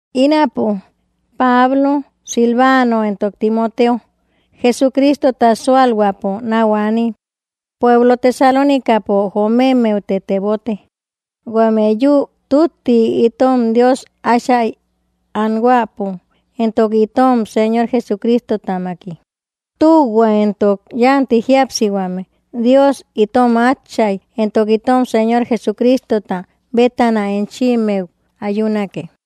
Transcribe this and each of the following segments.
Ínapo, Pablo, Silvano, entok Timoteo, Jesucristota súalhuäpo náu aanim pueblo Tesalónicapo jomemmeute tebote, huame yü tütti itom Dios Átchai anhuäpo entok itom Señor Jesucristotamaki: Tühua entok yánti jíapsihuame Dios itom Áchay entok itom Señor Jesucristota bétana enchimmeu ayunake.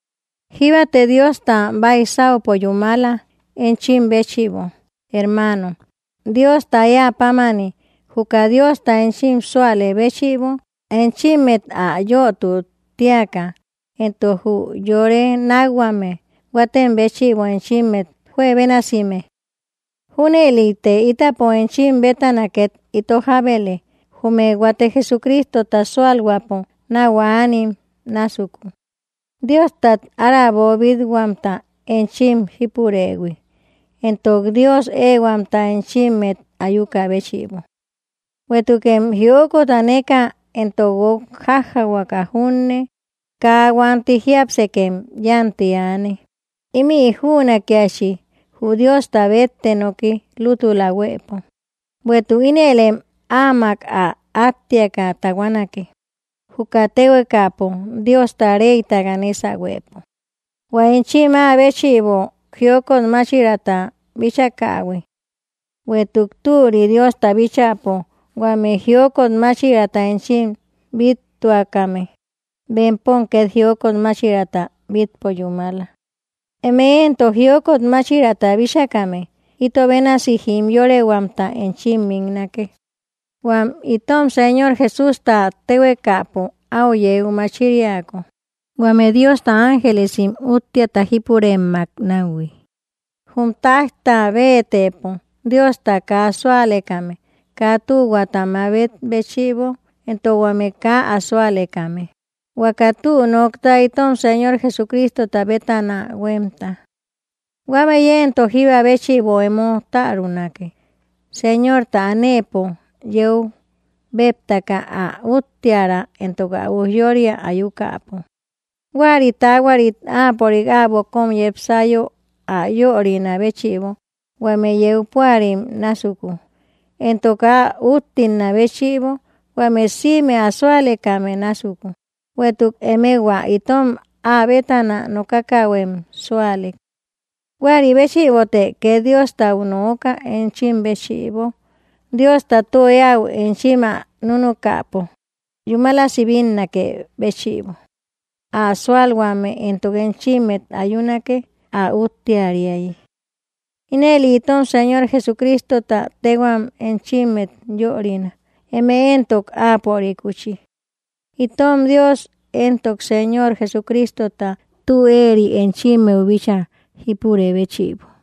Jíbate Diosta baisaupo yúmala, enchim béchïbo, hermaanom, Diosta éä pámani, juka Diosta enchim súalë béchïbo enchimmet ä yötu tíaka, entok jü yore nákhuame huatem béchïbo enchimmet juebénasime. Júnëlite ítapo enchim bétana két ito jábele, jume huate Jesucristota súalhuäpo náu anim násuku, Diostat ára boobit-huamta enchim jípurëhui, entok Dios éehuamta enchimmet ayukä béchïbo. Bueïtukem jiokot aneka, entok guok jájjahuaka junne, kaa huanti jiápsekem yánti aane. Ímï jünakiachi jü Diosta bétte noki lútula huëpo. Bueïtuk ínëlem Áamak ä áttiaka tahuanake, juka téhuekapo Diosta reytaka nésahuepo, hua enchim Áa béchïbo jiokot máchiraata bíchakähui. Bueïtuk türi Diosta bíchäpo huame jiokot máchiraata enchim bíttuakame, bempom két jiokot máchiraata bítpo yúmala. Eme éntok jiokot máchiraata bíchakame, ito bénasi jimyorehuamta enchim miknake, huám itom Señor Jesústa téhuekapo áu yeu machiriako, huame Diosta ángelesim útteata jípuremmak náuhui, jum táijta béetëpo Diosta kaa súalekame kaa tühuaata mabet béchïbo, entok huame kaa ä súalekame, huaka tü nokta itom Señor Jesucristota bétana huémta. Huámëi éntok jíba béchïbo emo tärunake, Señorta anëpo yeu béeptaka, ä úttiära entok ä ujyória ayukäpo, huäri taahuarit Áapörik äbo kóm yepsayo ä yörinä béchïbo huame yeu púarim násuku, entok ä úttilnä béchïbo huame sïme ä súalekame násuku; bueïtuk emëe huaka itom Áa bétana nokakähuem súalek. Huäri béchïbote két Diostau nooka enchim béchïbo, Diosta tü éäu enchim ä núnukäpo yúmalasi bínnakë béchïbo. Ä súalhuame éntok enchimmet ayunake, ä úttiärayi. Ínëli itom Señor Jesucristota téhuam enchimmet yörina, eme éntok Áapörikuchi, itom Dios entok Señor Jesucristota tü éeri enchimmeu bíchaa jípurë béchïbo.